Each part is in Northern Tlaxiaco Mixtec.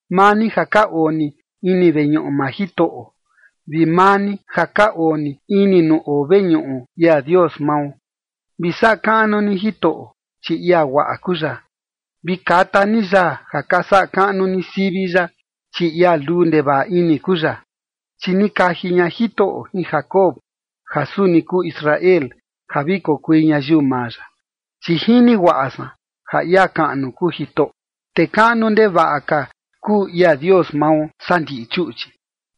maa ni ja ka oo ni ini veñuꞌu maa Jitoꞌo, vi maa ni ja ka oo ni ini nuu oo veñuꞌu ia Dios mao. Vi saꞌa kaꞌnu ni Jitoꞌo, chi ia guaꞌa kuu ya, vi kata ni yaa ja ka saꞌa kaꞌnu ni sivi ya, chi ia luu ndevaꞌa ini kuu ya. Chi ni kaji ña Jitoꞌo jin Jacob ja suni kuu Israel, ja vi kokui ñayiu maa ya. Chi jini guaꞌa san ja ia kaꞌnu kuu Jitoꞌo, te kaꞌnu ndevaꞌa ka, kuu ia Dios mao saa ndiꞌi chuꞌchi.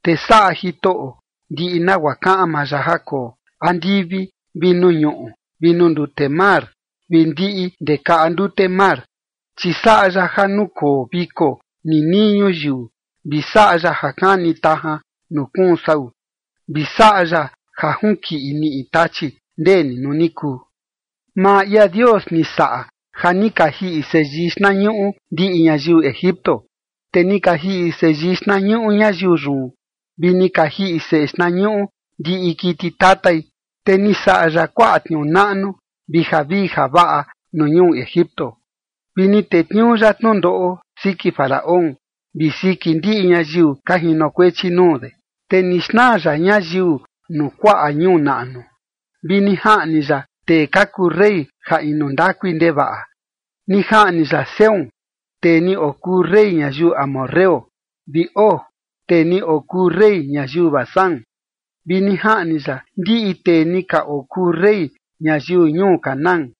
Te saꞌa Jitoꞌo ndiꞌi nagua kaꞌan maa ya ja koo andivi vi nuu ñuꞌu vi nuu ndute mar vi ndiꞌi ndee kaꞌa ndute mar. Chi saꞌa ya ja nukoo viko ninii ñuyiu, vi saꞌa ya ja kani tajan nuu kuun sau, vi saꞌa ya ja junkiꞌi niꞌi tachi, ndee ni nuu ni kuu. Maa ia Dios ni saꞌa ja ni ka jiꞌi seyii xtnañuꞌu ndiꞌi ñayiu Egipto, te ni ka jiꞌi seyii xtnañuꞌu ñayiu yun, vi ni ka jiꞌi seꞌe xtnañuꞌu ndiꞌi kiti tatai. Te ni saꞌa ya kuaꞌa tniuu naꞌnu vi javii javaꞌa nuu ñuu Egipto, vi ni tetniuu ya tnundoꞌo siki Faraón vi siki ndiꞌi ñayiu ka jinokuechi nuu de. Te ni xnaa ya ñayiu nuu kuaꞌa ñuu naꞌnu, vi ni jaꞌni ya tee ka kuu rey ja inu ndakui ndevaꞌa. Ni jaꞌni ya Sehón tee ni okuu rey ñayiu amorreo, vi Og, tee ni okuu rey ñayiu Basán, vi ni jaꞌni ya ndiꞌi tee ni ka okuu rey ñayiu ñuu Canaán.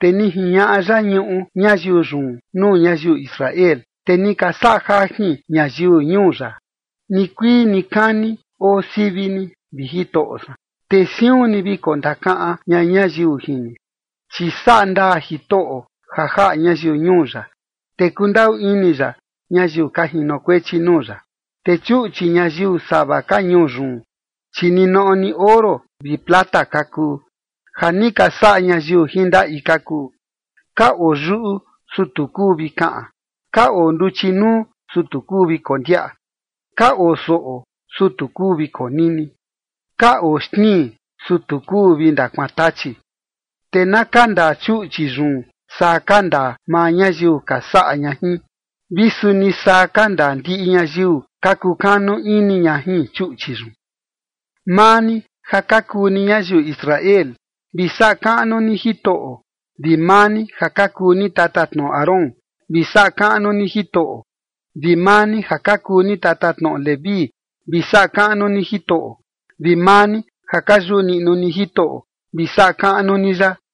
Te ni jiñaꞌa ya ñuꞌu ñayiu yun nuu ñayiu Israel, te ni ka saꞌa jajin ñayiu ñuu ya. Nikuii nikani oo sivi ni, vi Jitoꞌo san, te siun ni vi kondakaꞌan ña ñayiu jin ni. Chi saꞌa ndaa Jitoꞌo ja jaꞌa ñayiu ñuu ya, te kundaꞌu ini ya ñayiu ka jinokuechi nuu ya. Te chuꞌchi ñayiu sava ka ñuu yun, chi ninoꞌo ni oro vi plata ka kuu, ja ni ka saꞌa ñayiu jin ndaꞌi ka kuu. Ka oo yuꞌu, su tu kuu vi kaꞌan, ka oo nduchi nuu, su tu kuu vi kondiaꞌa, Ka oo soꞌo, su tu kuu vi konini, ka oo xtnii, su tu kuu vi ndakuantachi. Te na kandaa chuꞌchi yun saa kandaa maa ñayiu ka saꞌa ña jin, vi suni saa kandaa ndiꞌi ñayiu ka kukanu ini ña jin chuꞌchi yun. Maa ni ja ka kuu ni ñayiu Israel, vi saꞌa kaꞌnu ni Jitoꞌo, vi maa ni ja ka kuu ni tatatnoꞌo Aarón, vi saꞌa kaꞌnu ni Jitoꞌo, vi maa ni ja kuu ni tatatnoꞌo Leví, vi saꞌa kaꞌnu ni Jitoꞌo, vi maa ni ja ka yuꞌu niꞌnu ni Jitoꞌo, vi saꞌa kaꞌnu ni ya.